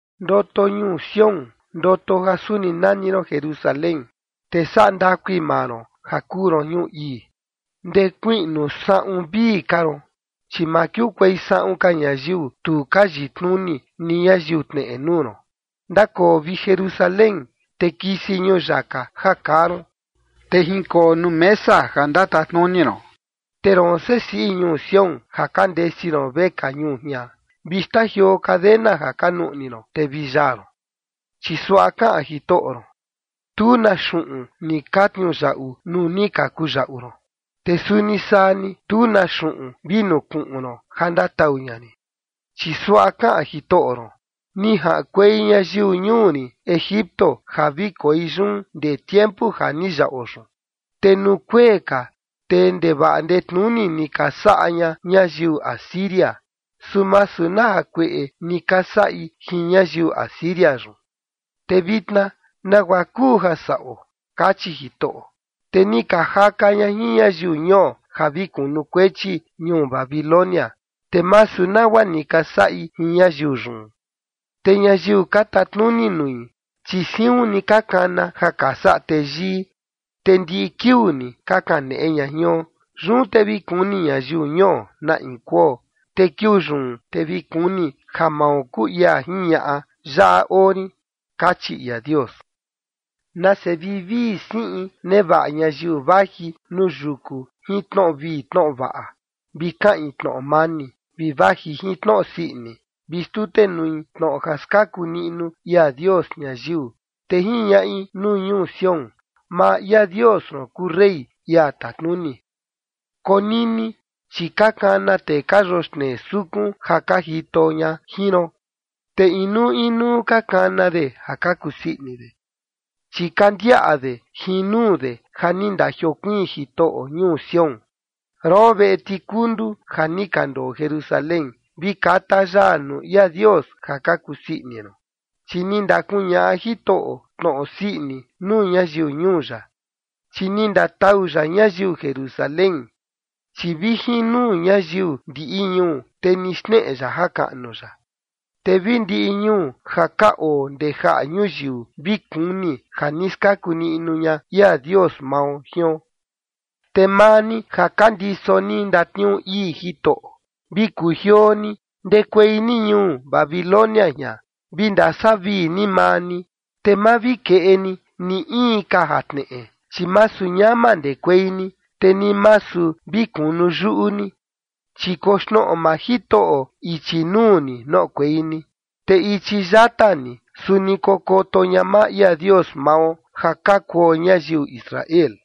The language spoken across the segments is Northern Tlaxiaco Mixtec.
Ndoto ñuu Sión, ndoto ja suni nani ron Jerusalén, te saꞌa ndakui maa ron, ja kuu ron ñuu ii. Ndekuiꞌnu saꞌun vii ka ron, chi ma kiukuei saꞌun ka ñayiu tu ka yitnuni, ni ñayiu tneꞌe nuu ron. Ndakoo, vi Jerusalén, te kisi ñuyaka ja kaa ron, te jinkoo nuu mesa ja ndatatnuni ron. Te roon, sesiꞌi ñuu Sión ja ka ndesi ron vekaa ñuu jian, vi xtajioo cadena ja ka nuꞌni ron, te vi yaa ron. Chi suaꞌa kaꞌan Jitoꞌo ron: “Tu na xuꞌun ni ka tniuyaꞌu nuu ni ka kuyaꞌu ron, te suni saa ni, tu na xuꞌun vi nukuꞌun ron ja ndatau ña rin”. Chi suaꞌa kaꞌan Jitoꞌo ron: “Ni jaꞌankuei ñayiu ñuu rin Egipto ja vi koi yun ndee tiempu ja ni yaꞌo yun, te nuu kuee ka te ndevaꞌa ndetnuni ni ka saꞌa ña ñayiu Asiria, su masu na jakueꞌe ni ka saꞌi jin ñayiu Asiria yun”. Te vitna, “¿nagua kuu ja saꞌo?”, kachi Jitoꞌo. “Te ni ka jaka ña jin ñayiu ñuo ja vi kunukuechi ñuu Babilonia, te masu nagua ni ka saꞌi jin ñayiu yun. Te ñayiu ka tatnuni nui, chi siun ni ka kana ja ka saꞌa teyii, te ndiꞌi kiuu ni ka kaneꞌe ña jion. Yun te vi kuni ñayiu ñuo na ia kuo, te kiuu yun te vi kuni ja mao kuu ia jiñaꞌa: Yaꞌa oo rin”, kachi ia Dios. Nase vivii siꞌin nevaꞌa ñayiu vaji nuu yuku jin tnoꞌo vii tnoꞌo vaꞌa, vi kaꞌin tnoꞌo mani, vi vaji jin tnoꞌo sii ini, vi xtutenui tnoꞌo ja skaku niꞌnu ia Dios ñayiu, te jiñaꞌi nuu ñuu Sión: “Maa ia Dios ron kuu rey, ia tatnuni”. Konini, chi ka kana tee ka yoxnee sukun ja ka jito ña jin ron, te inuu inuu ka kana de ja ka kusii ini de, chi ka ndiaꞌa de jin nuu de ja ni ndajiokuiin Jitoꞌo ñuu Sión. Roon, veꞌe tikundu ja ni ka ndoo Jerusalén, vi kata yaa nuu ia Dios ja ka kusii ini ron, chi ni ndakuñaꞌa Jitoꞌo tnoꞌo sii ini nuu ñayiu ñuu ya, chi ni ndatau ya ñayiu Jerusalén. Chi vi jin nuu ñayiu ndiꞌi ñuu, te ni xneꞌe ya jakaꞌnu ya, te vi ndiꞌi ñuu ja ka oo ndee jaꞌa ñuyiu vi kuni ja ni skaku niꞌnu ña ia Dios mao jion. Te maa ni ja ka ndiso ni ndatniuu ii Jitoꞌo, vi kujioo ni, ndekuei ni ñuu Babilonia jian, vi ndasavii ni maa ni, te ma vi keꞌe ni, ni in ka jatneꞌe. Chi masu ñama ndekuei ni, te ni masu vi kunu yuꞌu ni, chi koxnoꞌo maa Jitoꞌo ichi nuu ni noꞌokuei ni, te ichi yata ni suni kokoto ña maa ia Dios mao ja ka kuo ñayiu Israel.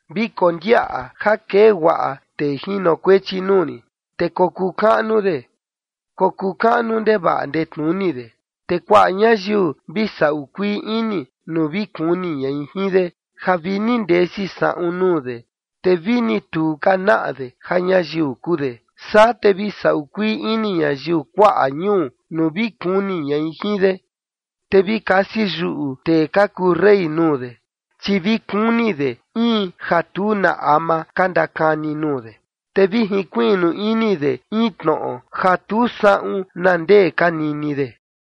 Vi kondiaꞌa ja kee guaꞌa tee jinokuechi nuu rin, te kokuu kaꞌnu de, kokuu kaꞌnu ndevaꞌa ndetnuni de. Te kuaꞌa ñayiu vi saꞌu kuii ini nuu vi kuni ñai jin de, ja vini ndesi saꞌun nuu de, te vini tu ka naꞌa de ja ñayiu kuu de. Saa te vi saꞌu kuii ini ñayiu kuaꞌa ñuu nuu vi kuni ñai jin de, te vi kasi yuꞌu tee ka kuu rey nuu de, chi vi kuni de in ja tu na ama ka ndakani nuu de, te vi jinkuiꞌnu ini de in tnoꞌo ja tu saꞌun na ndee ka nini de.